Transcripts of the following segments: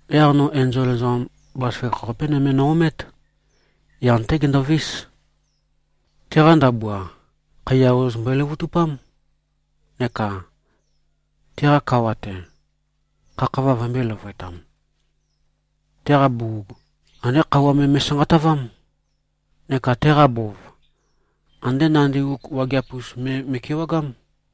Yaq no enzol ezoqam bazaføgakh-qape nøme no-omét. Yan-té gendovís. Teqa ndabua, khaiya ozoz mbøe-løvøtupám, neka teqa kawa-te, khakhava vømbø̄e-løvøetam. Teqa bugug, andé khøuwa me me꞉sanqatavám, neka teqa bov, andé nandi uk wageap-us me me꞉kewagám.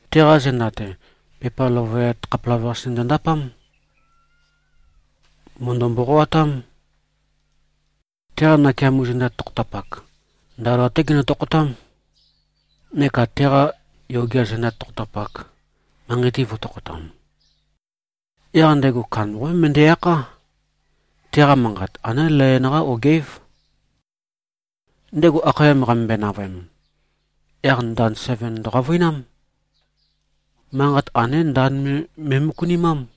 Teqa zenda-te, pepa løvøyat khapelavøqase ndøndapám. Mø̀ndø-mboqoatám. Teqa nakeamo zenda tokhotapak, ndaola-té genø-tokhotám, neka teqa yogea zenda tokhotapak, manqei-te vø̄tokhotam. Yaq ndego kandambaqapé møndæ-akhá. Teqa manqat, andé layon-qá ogeǽv. Ndego akhayam qamømbøe-navøem, yaq ndand seven ndøqavøinám. Manqat andé ndand me me꞉møkunimám.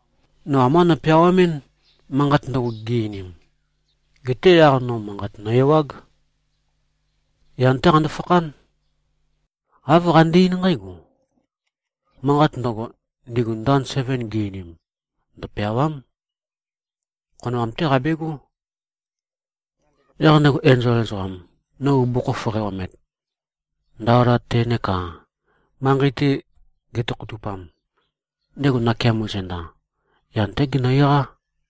No ambá nopeawamɨ́n, manqat ndøgo, gi-einim. Geté yaq no manqat nø-ewág. Yan-té qando-fakhán. Āv qande-eín nqǽgo: “Manqat ndøgo, ndigu ndand seven gi-einim, ndøpeàwa᷄m. Khonoam-té qabegó.” Yaq ndego enzol ezoqam, no bugukhokhof qæ-omet, ndaola-te neka manqei-te getokhotupam, ndego nakeamo zenda, yan-té genø-eqá.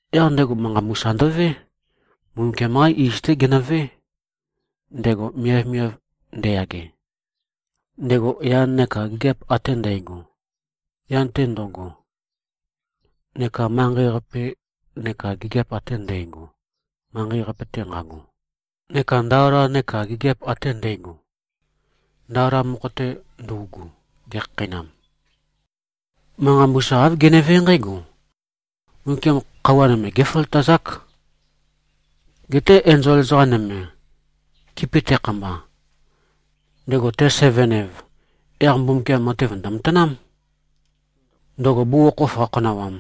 Yaq ndego, manqa mbusa ndøvé. Mbumbukiam-qá iz-té genøvé, ndego miavmiav ndeyage, ndego yan neka gigiap ate ndægo yan-te ndo꞉go, neka manqei-qape neka gigiap ate ndægo, manqei-qape-te nqago, neka ndaola neka gigiap ate ndægo, ndaola mokho-te ndøugu, gekhakheinam. Manqa mbusa, āv genevé nqǽgo, “Mbumbukiam khøuwa nøme géføløtazák. Geté enzol ezoqa nøme, kipi tekhamba, ndego te-seven-ev, yaq Mbumbukiam matev ndø̀matanám, ndøgo bugukhokhof qakhonawam,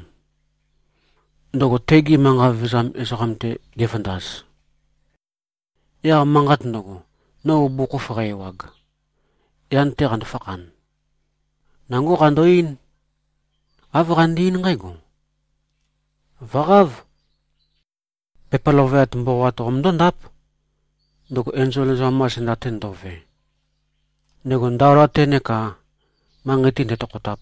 ndøgo tegi manqa vevezam ezoqam-te gevøndaz.” Yaq manqat ndøgo, no bugukhokhof qæ-ewag, yan-te qando-fakhan, nangó qando-eín. Āv qande-eín nqǽgo, “Vø̀qáv. Pepa løvøyat mboqoat qomøndó-ndáp, ndøgo enzol ezoqam-qa zenda-te ndo꞉ve, ndego ndaola-te neka manqei-te ndetokhotap.”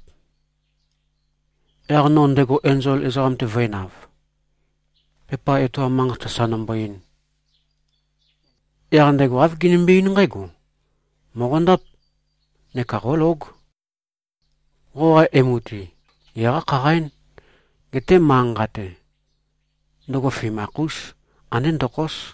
Yaq no ndego enzol ezoqam-te vø̄enav, pepa etoam manqat sasa nombo-ein. Yaq ndego āv genømbe-eín nqǽgo, “Mòqondáp. Neka qólóg. Qoqa emu-te, geqá-khaqaín. Geté manqa-nqa-te, ndøgo fimakh-ús. Andé ndokhós.”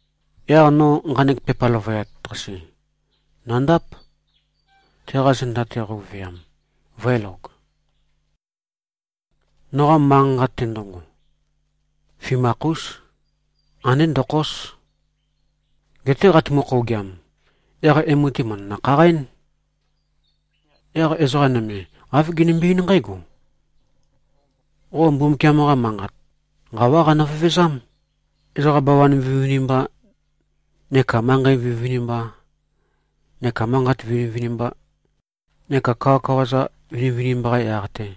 Yaq no nqanek pepa løvøyat-qase, nø̀ndáp, teqa zenda-te qøuveam, vø̄elog. Noqa manqa-nqa-te ndøgo, fimakh-ús. Andé ndokhós. Geté qatumu-khougiam, yaq emu-te, mø̀ndønø-khaqaín. Yaq ezoqa nøme, āv genømbe-eín nqǽgo, “Qo Mbumbukiam-qa Manqat nqawá qanø-vevezám, ezoqa bawan vinivinimba neka manqei vinivinimba neka manqat vinivinimba neka kawakawa-za vinivinimba-qa yaq-te.”